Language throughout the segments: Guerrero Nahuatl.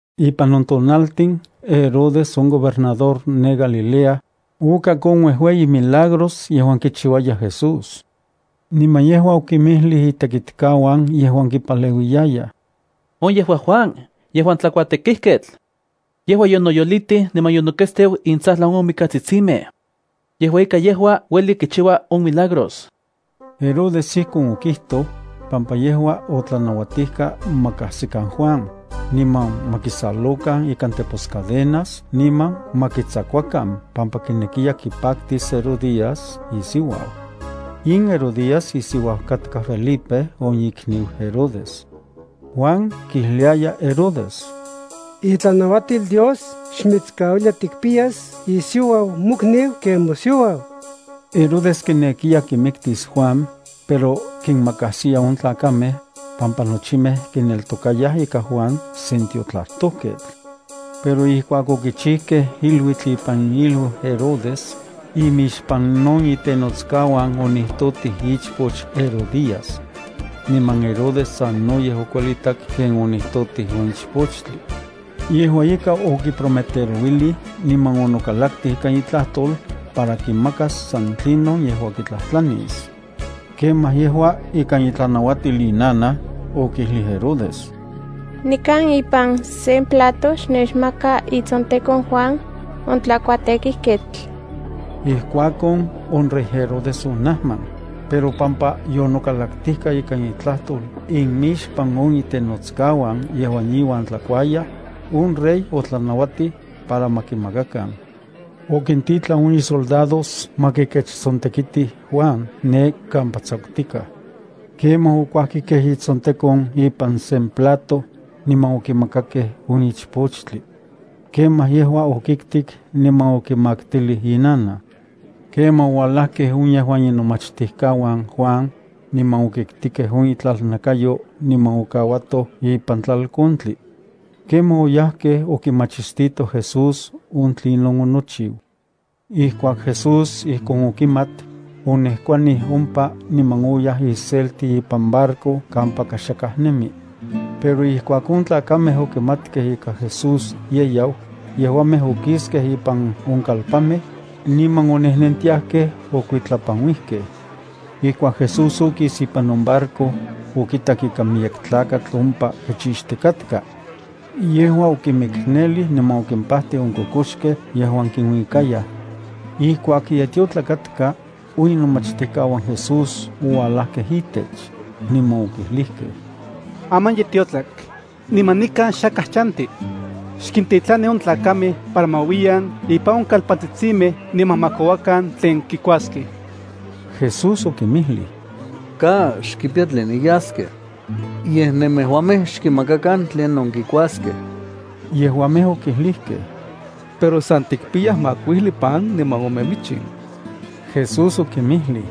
Ipan on tonaltin, Herodes, on gobernador ne Galilea, okak on uejueyi milagros yejuan kichiuaya Jesús. Niman yejua okinmijlij itekitkauan yejuan kipaleuiyayaj: —On yejua Juan yejuan tlakuatekijketl. Yejua yonoyolitij niman yonoketsteu intsajlan on mikatsitsimej. Yejua ika yejua ueli kichiua on milagros. Herodes ijkon okijtoj, pampa yejua otlanauatijka ma kajsikan Juan, niman ma kisalokan ikan teposcadenas niman ma kitsakuakan pampa kinekiya kipaktis Herodías isiuau. In Herodías isiuau katka Felipe on ikniu Herodes. Juan kijliaya Herodes: —Itlanauatil Dios xmitskauilia tikpiyas isiuau mokniu ken mosiuau. Herodes kinekiya kimiktis Juan, pero kinmakajsiya on tlakamej, pampa nochimej kineltokayaj ika Juan sen tiotlajtojketl. Pero ijkuak okichijkej iluitl ipan iluiu Herodes, imixpan on itenotskauan onijtotij ichpoch Herodías. Niman Herodes sanoyej okuelitak ken onijtotij on ichpochtli. Yejua ika okiprometerouilij niman onokalaktij ikan itlajtol para kimakas san tlinon yejua kitlajtlanis. Kemaj yejua ikan itlanauatil inanaj okijlij Herodes: —Nikan ipan sen plato xnechmaka itsontekon Juan on tlakuatekijketl. Ijkuakon, on rey Herodes onajman, pero pampa yonokalaktijka ikan itlajtol inmixpan on itenotskauan yejuan iuan tlakuayaj, on rey otlanauatij para ma kimakakan. Okintitlan on isoldados ma kikechtsontekitij Juan ne kampa tsakutikaj. Kemaj okuajkikej itsontekon ipan sen plato, niman okimakakej on ichpochtli. Kemaj yejua okiktik niman okimaktilij inanaj. Kemaj oualajkej on yejuan inomachtijkauan Juan, niman okitkikej on itlalnakayo niman okauatoj ipan tlalkontli. Kemaj oyajkej okimachistitoj Jesús on tlinon onochiu. Ijkuak Jesús ijkon okimat, onejkuanij ompa niman oyaj iselti ipan barco kampaka xakaj nemi. Pero ijkuak on tlakamej okimatkej ika Jesús ye yau, yejuamej okiskej ipan on kalpanmej, niman onejnentiajkej okuitlapanuijkej. Ijkuak Jesús okis ipan on barco, okitak ika miyek tlakatl ompa kichixtikatka. Yejua okimiknelij niman okimpajtij on kokoxkej yejuan kinuikayaj. Ijkuak ye tiotlak katka, on inomachtijkauan Jesús oualajkej itech, niman okijlijkej: —Aman ye tiotlak, niman nikan xakaj chanti. Xkintitlani on tlakamej para ma uiyan ipan on kalpantsitsimej niman ma kouakan tlen kikuaskej. Jesús okinmijlij: —Ka, xkipiyaj tline yaskej. Yej nemejuamej xkinmakakan tlinon kikuaskej. Yejuamej okijlijkej: —Pero san tikpiyaj makuijli pan niman ome michin. Jesús okinmijlij: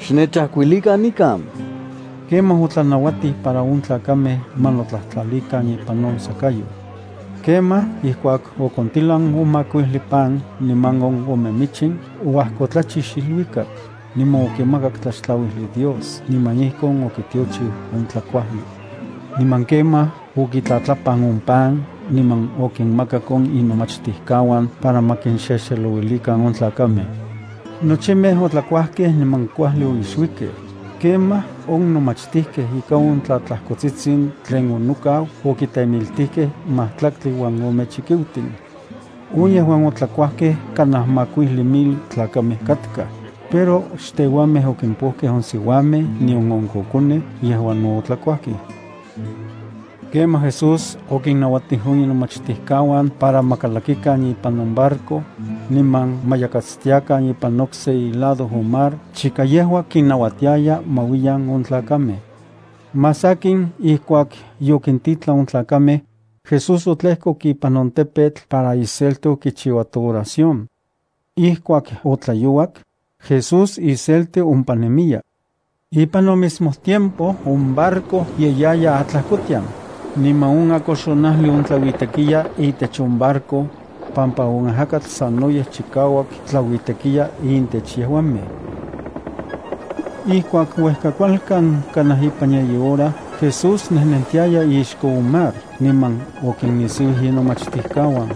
—Xnechajkuilikan nikan. Kemaj otlanauatij para on tlakamej ma notlajtlalikan ipan on sakayoj. Kemaj, ijkuak okontilan on makuijli pan niman on ome michin, oajkotlachix iluikak niman okimakak tlaxtlauijli Dios niman ijkon okitiochiu on tlakuajli. Niman kemaj okitlatlapan on pan niman okinmakak on inomachtijkauan para ma kinxexelouilikan on tlakamej. Nochimej otlakuajkej niman kuajli oixuikej. Kemaj on nomachtijkej ika on tlatlajkotsitsin tlen onokau okitemiltijkej majtlaktli uan ome chikiutin. On yejuan otlakuajkej kanaj makuijli mil tlakamej katkaj, pero xtejuamej okimpokej on siuamej nion on kokonej yejuan no otlakuajkej. Kemaj Jesús okinnauatij on inomachtijkauan para ma kalakikan ipan on barco, niman ma yakatstiakan ipan okse ilado on mar chika yejua kinnauatiaya ma uiyan on tlakamej. Más sakin, ijkuak yokintitlan on tlakamej, Jesús otlejkok ipan on tepetl para iselti okichiuato oración. Ijkuak otlayouak, Jesús iselti ompa nemiya. Ipan on mismo tiempo, on barco ye yaya atlajkotian, niman on akoxonajli ontlauitekiya itech on barco, pampa on ajakatl sanoyej chikauak tlauitekiya intech yejuamej. Ijkuak uejkakualkan kanaj ipan yeyi hora, Jesús nejnentiaya ixko on mar, niman okinnisiuij inomachtijkauan.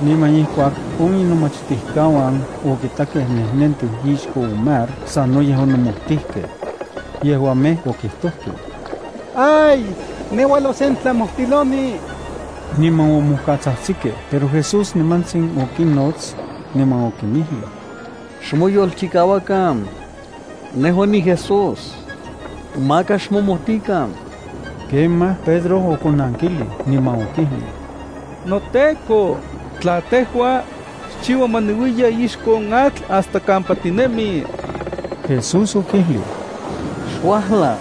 Niman ijkuak on inomachtijkauan okitakej nejnentiu ixko on mar, sanoyej onomojtijkej. Yejuamej okijtojkej: —¡Ay! ¡Ne uajlau sen tlamojtiloni! Niman omojkatsajtsikej. Pero Jesús nimantsin okinnots, niman okinmijlij: —Xmoyolchikauakan. Nejua niJesús. Maka xmomojtikan. Kemaj, Pedro okonankilij, niman okijlij: —NoTEKO, tla tejua, xchiua ma niuiya ixko on atl hasta kampa tinemi. Jesús okijlij: —Xuajla.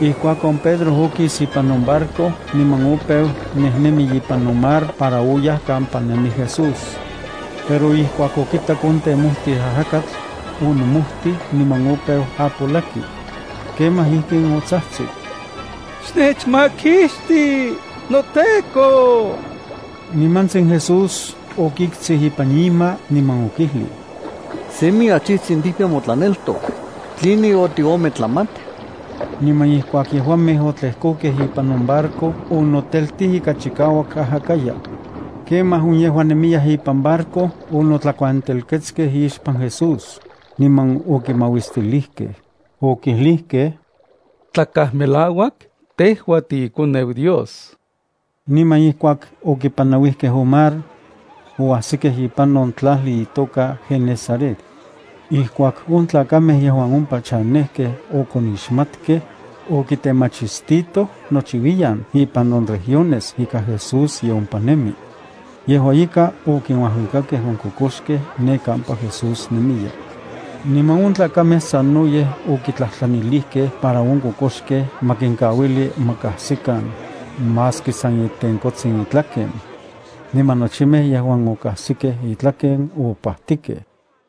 Ijkuakon, Pedro okis ipan on barco, niman opeu nejnemi ipan on mar para oyaj kampa nemi Jesús. Pero ijkuak okitak on temojtij ajakatl, onomojtij niman opeu apolaki. Kemaj ijkin otsajtsik: —¡Xnechmakixti, noTEKO! Nimantsin Jesús okiktsij ipan ima, niman okijlij: —¡Semi achijtsin tikpiya motlaneltok! ¿Tline otiometlamat? Niman ijkuak yejuamej otlejkokej ipan on barco, onoteltij ika chikauak ajakaya. Kemaj on yejuan nemiyaj ipan barco onotlakuantelketskej ixpan Jesús, niman okimauistilijkej. Okijlijkej: —Tlakaj melauak tejua tiiKoneu Dios. Niman ijkuak okipanauijkej on mar, oajsikej ipan on tlajli itoka Genesaret. Ijkuak on tlakamej yejuan ompa chanejkej okonixmatkej, okitemachistitoj nochiuiyan ipan on regiones ika Jesús ye ompa nemi. Yejua ika, okinuajuikakej on kokoxkej ne kampa Jesús nemiya. Niman on tlakamej sanoyej okitlajtlanilijkej para on kokoxkej ma kinkauili ma kajsikan, maski san itenkotsin itlaken. Niman nochimej yejuan okajsikej itlaken, opajtikej.